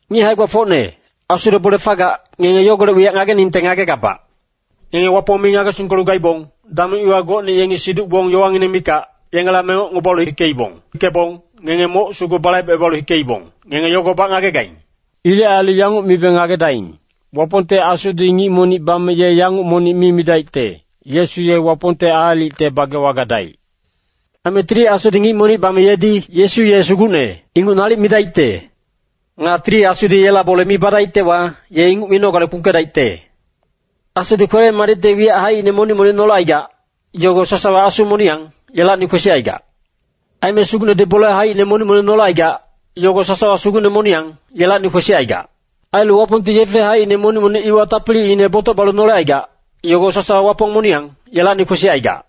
Ngic hae-gbafocne, Asule bole fagac, ngenge yogolec wiyac ngageningte ngagegabac. Ngenge Wapong mi ngagesingkelu gaibong, dameng iwa gocne yengi siduc-gbong yowangineng mikac, yengela mengocngebalu hikeibong. Hikebong ngenge moc sugu balaibecebalu hikeibong, ngenge yogobac ngagegaing. Ilec ailu yanguc mibe ngagedaing, Wapongte Asudi ngic monic bame ye yanguc monic mi midaicte, “Yesu ye Wapongte aalicte bagewa gadaic.” Aime Tili Asudi ngic monic bame yedi “Yesu ye Sugucne” inguc nalic midaicte. Nga Tili Asudi yela bole mi badaictewa, ye inguc minogale kpungkedaicte. Asudi kwele-madicte wiyac haicine monic-monic nolecaigac, yogo sasawa Asu moniyang, yelacni kwesicaigac. Aime Sugucnedi bole haicine monic-monic nolecaigac, yogo sasawa Sugucne moniyang, yelacni kwesicaigac. Ailu Wapongti yefe haicine monic-monic iwa tapiliine botoc balu nolecaigac, yogo sasawa Wapong moniyang, yelacni kwesicaigac.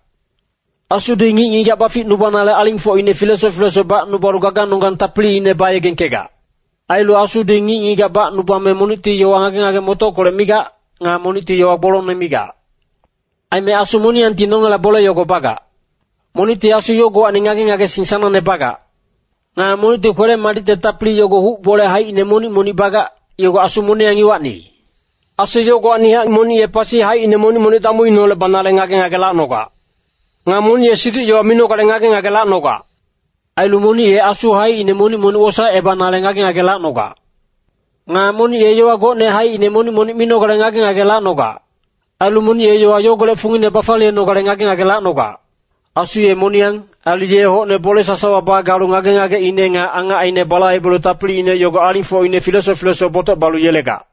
Asudi ngic-ngigac baficnubanale alingfocine filesoc filesoc bacnubalu gaganonggang tapiliine bayegengkegac. Ailu Asudi ngic-ngigac bacnubame monicti yowa ngage-ngage-motockolec migac. Nga monicti yowa gbolongne migac. Aime Asu moniyangti nongela bole yogo bagac. Monicti Asu yogowacni ngage-ngagesing sanangne bagac. Nga monicti kwele-madicte tapili yogo huc bole haicine monic-monic bagac, yogo Asu moniyang iwacni. Asu yogowacnihac monic ye pasi haicine monic-monic damuineholec banale ngage-ngage lacnogac. Nga monic ye siduc-yowa minogale ngage-ngage lacnogac. Ailu monic ye asu haicine monic-monic wosaecebanale ngage-ngage lacnogac. Nga monic ye yowa gocne haicine monic-monic minogale ngage-ngage lacnogac. Ailu monic ye yowa yogolec fungine bafaliyenogale ngage-ngage lacnogac. Asu ye moniyang. Ailu ye hocne bole sasawa bagalu ngage-ngageine nga angacine balaibelu tapiliine yogo alingfocine filesoc filesoc botoc balu yelegac.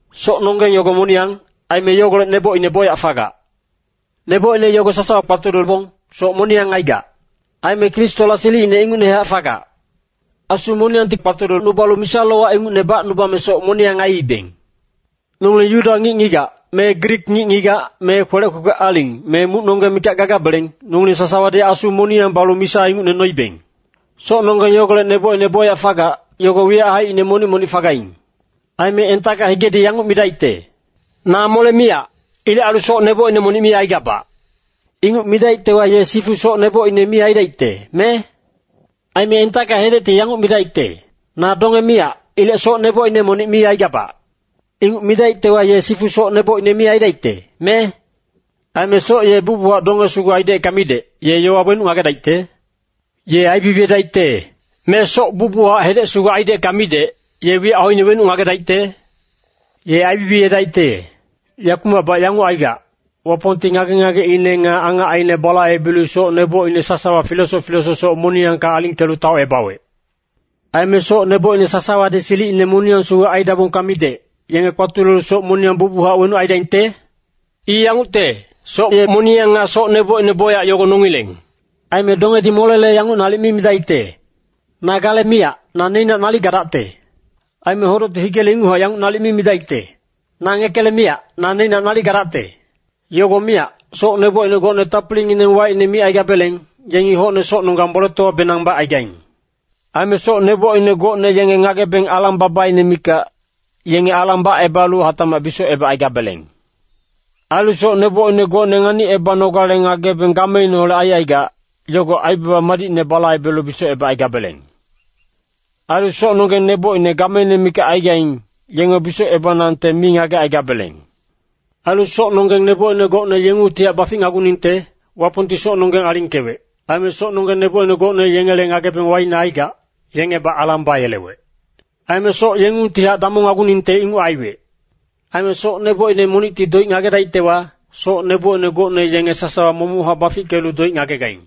Socnonggeng yogo moniyang, aime yogolec nebocine bocyac fagac. Nebocine yogo sasawa kpatulebong, soc moniyang aigac. Aime Kristola silicine ingucnehac fagac. Asu moniyangti kpatulecnubalu misa-lowac ingucne bacnubame soc moniyang aiibeng. Nongileng Yuda ngic-ngigac, me Grik ngic-ngigac, me kwelec kwekwe aling, me mucnonggeng mikac gagabeleng, nongileng sasawadi Asu moniyang balu misa ingucne noibeng. Socnonggeng yogolec nebocine bocyac fagac, yogo wiyac haicine monic-monic fagaing. Aime entacka higedi yanguc midaicte, “Na mole miyac. Ilec ailu soc nebocine monic mi aigabac.” Inguc midaictewa, ye sifu soc nebocine mi aidaicte, me? Aime entacka hedecti yanguc midaicte, “Na donge miyac. Ilec soc nebocine monic mi aigabac.” Inguc midaictewa, ye sifu soc nebocine mi aidaicte, me? Aime soc ye bucbuchac donge sugu aidecka midec, ye yowa wenuc ngagedaicte? Ye aibibiyedaicte. Me soc bucbuchac hedec sugu aidecka midec, ye wiyac hoine wenuc ngagedaicte? Ye aibibiyedaicte. Yakumacbac yanguc aigac, Wapongti ngage-ngageine nga angacine balaibelu soc nebocine sasawa filesoc filesoc soc moniyangka alingkelu taocebawec. Aime soc nebocine sasawadi silicine moniyang sugu aidabongka midec, yenge kpatulelu soc moniyang bucbuchac wenuc aidaingte? I yangucte, soc ye moniyang nga soc nebocine bocyac yogo nongileng. Aime dongedi molele yanguc nalic mi midaicte, “Na gale miyac, na neicnac nalic gadacte.” Aime hodocti higele inguchac yanguc nalic mi midaicte, “Na ngekele miyac, na neicnac nalic gadacte.” Yogo miyac, soc nebocine gocne tapilingineng waicne micaigabeleng, yengi hocne socnonggang boletowabenang bacaigaing. Aime soc nebocine gocne yenge ngagebeng alang-babaine mikac, yenge alang bacebalu hatacmac bisocebacaigabeleng. Ailu soc nebocine gocne nganicebanogale ngagebeng gameineholec aicaigac, yogo aibaba madicne balaibelu bisocebacaigabeleng. Ailu socnonggeng nebocine gameine mikac aigaing, yenge bisocebanangte mi ngagecaigabeleng. Ailu socnonggeng nebocine gocne yengungtihac baficnaguningte, Wapongti socnonggeng alingkewec. Aime socnonggeng nebocine gocne yengele ngagebeng waicne aicaigac, yengebac alang bayelewec. Aime soc yengungtihac damongnaguningte inguc aiwec. Aime soc nebocine monicti doic ngagedaictewa, socine nebocine gocne yenge sasawa momochac bafickelu doic ngagegaing.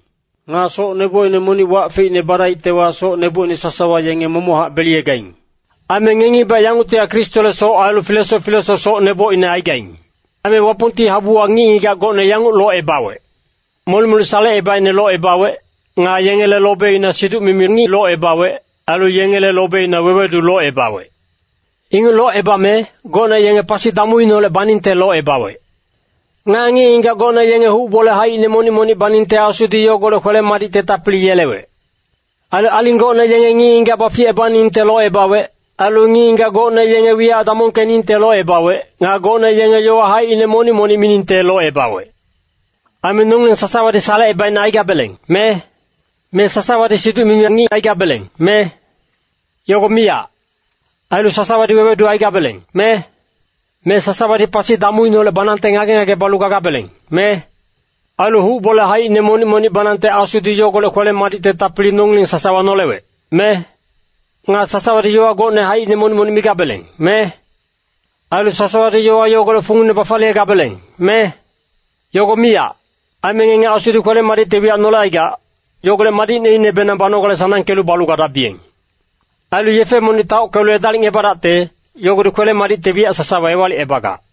Nga soc nebocine monic wac feicne badaictewa, soc nebocine sasawa yenge momochac beliyegaing. Aime ngengibac yanguctihac Kristole soc ailu filesoc filesoc soc nebocine aigaing. Aime Wapongti habuwa ngic-ngigac gocne yanguc locebawec. Molic-molic salecebaicne locebawec. Nga yengele lobeina siduc-mimi ngic locebawec. Ailu yengele lobeina wewedu locebawec. Inguc locebame, gocne yenge pasi damuineholec baningte locebawec. Nga ngic-ngigac gocne yenge huc bole haicine monic-monic baningte Asudi yogolec kwele-madicte tapili yelewec. Ailu aling gocne yenge ngic-ngigac baficebaningte locebawec. Ailu ngic-ngigac gocne yenge wiyac damongkeningte locebawec. Nga gocne yenge yowa haicine monic-monic miningte locebawec. Aime nongileng sasawadi salecebaicne aigabeleng, me? Me sasawadi siduc-mimi ngic aigabeleng, me? Yogo miyac. Ailu sasawadi wewedu aigabeleng, me? Me sasawadi pasi damuineholec banangte ngage-ngage balu gagabeleng, me? Ailu huc bole haicine monic-monic banangte Asudi yogolec kwele-madicte tapili nongileng sasawa nolewec, me? Nga sasawadi yowa gocne haicine monic-monic migabeleng, me? Ailu sasawadi yowa yogolec fungine bafaliyegabeleng, me? Yogo miyac. Aime ngenge Asudi kwele-madicte wiyac nolecaigac, yogolec madicneinebenang banogale sanangkelu balu gadabiyeng. Ailu yefe monic taockelu edalicngebadacte, yogodi kwele-madicte wiyac sasawa ewalicebagac.